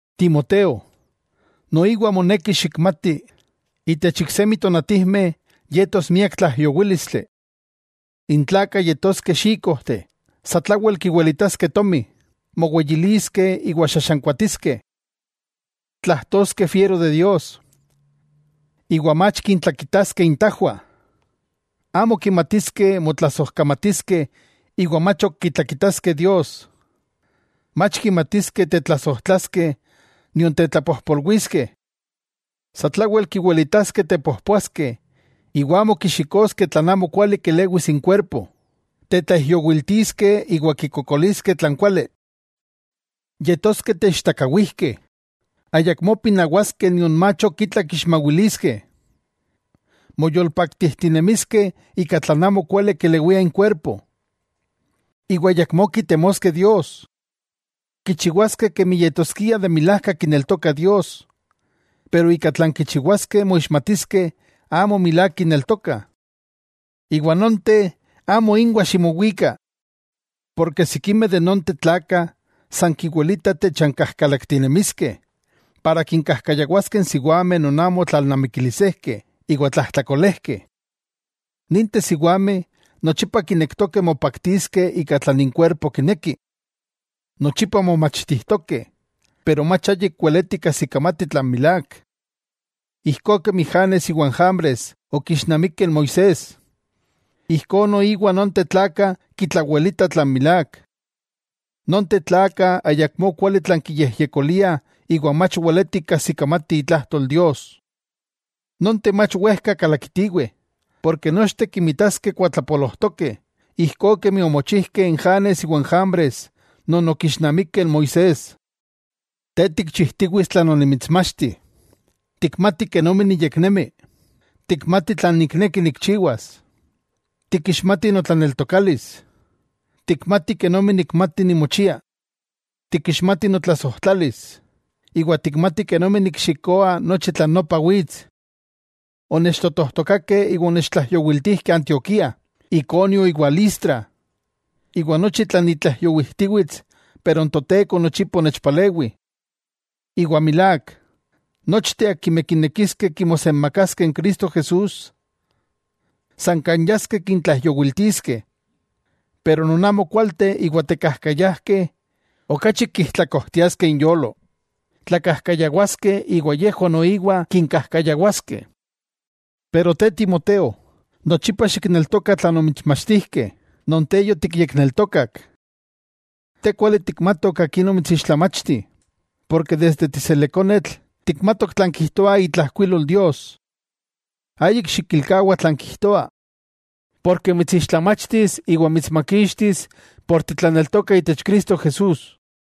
Timoteo, noiwa moneki xikmati, itech iksemi tonatijmeh yetos miak tlaijyowílistli. N tlakah yetoskeh xíkojteh, satlawel kiwilitaskeh tomi, moweyiliskeh iwa xaxankuatiskeh. Tlajtoskeh fiero de Dios, iwa mach kintlakitaskeh intajwah. Amo kimatiskeh motlasojkamatiskeh iwa mach ok kitlakitaskeh Dios. Mach kimatiskeh tetlasojtlaskeh nion tetlapojpolwiskeh. Satlawel kiwilitaskeh tepojpoaskeh iwa amo kixikoskeh tlan amokuali kelewis inkuerpo, tetlaijyowiltiskeh iwa kikokoliskeh tlan kuali. Yetoskeh teichtakawijkeh, ayakmó pinawaskeh nion mach itla kixmawiliskeh. Moyolpaktijtinemiskeh ika tlan amo kuali kelewia inkuerpo, iwa ayakmó kitemoskeh Dios. Kichiwaskeh kemi yetoskiah de milajka kineltokah Dios, pero ika tlan kichiwaskeh moixmatiskeh amo milák kineltokah. Iwa nonteh amo inwah ximowika. Porke sikimeh de nonteh tlakah kiwilitah techankajkalaktinemiskeh, ika kinkajkayawaskeh n siwameh non amo tlalnamikilisejkeh iwa tlajtlakolejkeh. Ninteh siwameh nochipa kinektokeh mopaktiskeh ika tlan inkuerpo kineki. Nochipa momachtijtokeh, pero mach ayik weletih kajsikamatih tlan milák. Ijkó kemi Janes iwa n Jambres okixnamikeh n Moisés, ijkó noiwa nonteh tlakah kitlawelitah tlan milák. Nonteh tlakah ayakmó kuali tlan kiyejyekoliah iwa mach weletih kajsikamatih itlajtol Dios. Nonteh mach wejka kalakitiweh, porke nochteh kinmitaskeh kuatlapolojtokeh, ijkó kemi omochijkeh n Janes iwa n Jambres non okixnamikeh n Moisés. Te tikchijtiwits tlan onimitsmachti, tikmati kenomi niyeknemi, tikmati tlan nikneki nikchiwas, tikixmati notlaneltokalis, tikmati kenomi nikmati nimochia, tikixmati notlasojtlalis, iwa tikmati kenomi nikxikoa nochi tlan nopa wits. Onechtotojtokakeh iwa onechtlaijyowiltijkeh Antioquía, Iconio iwa Listra, iwa nochi tlan nitlaijyowijtiwits pero n Toteko nochipa onechpalewi. Iwa milák, nochteh akimeh kinekiskeh kimosenmakaskeh Cristo Jesús, san kan yaskeh kintlaijyowiltiskeh. Pero non amokualteh iwa tekajkayajkeh okachi kijtlakojtiaskeh inyolo, tlakajkayawaskeh iwa yejwah noiwa kinkajkayawaskeh. Te Timoteo, nochipa xikneltoka tlan omitsmachtijkeh, non te yotikyekneltokak. Te kuali tikmatok akin omitsixtlamachti, desde tiselekonetl tikmatok tlan kijtoa itlajkuilol Dios. Ayik xikilkawa tlan kijtoa, porke mitsixtlamachtis iwa mitsmakixtis ken titlaneltoka itech Cristo Jesús.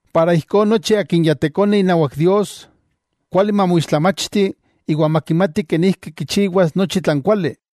Ijkó nochi akin ya tekone inawak Dios, kuali mamoixtlamachti iwa makimati kenijki kichiwas nochi tlan kuali.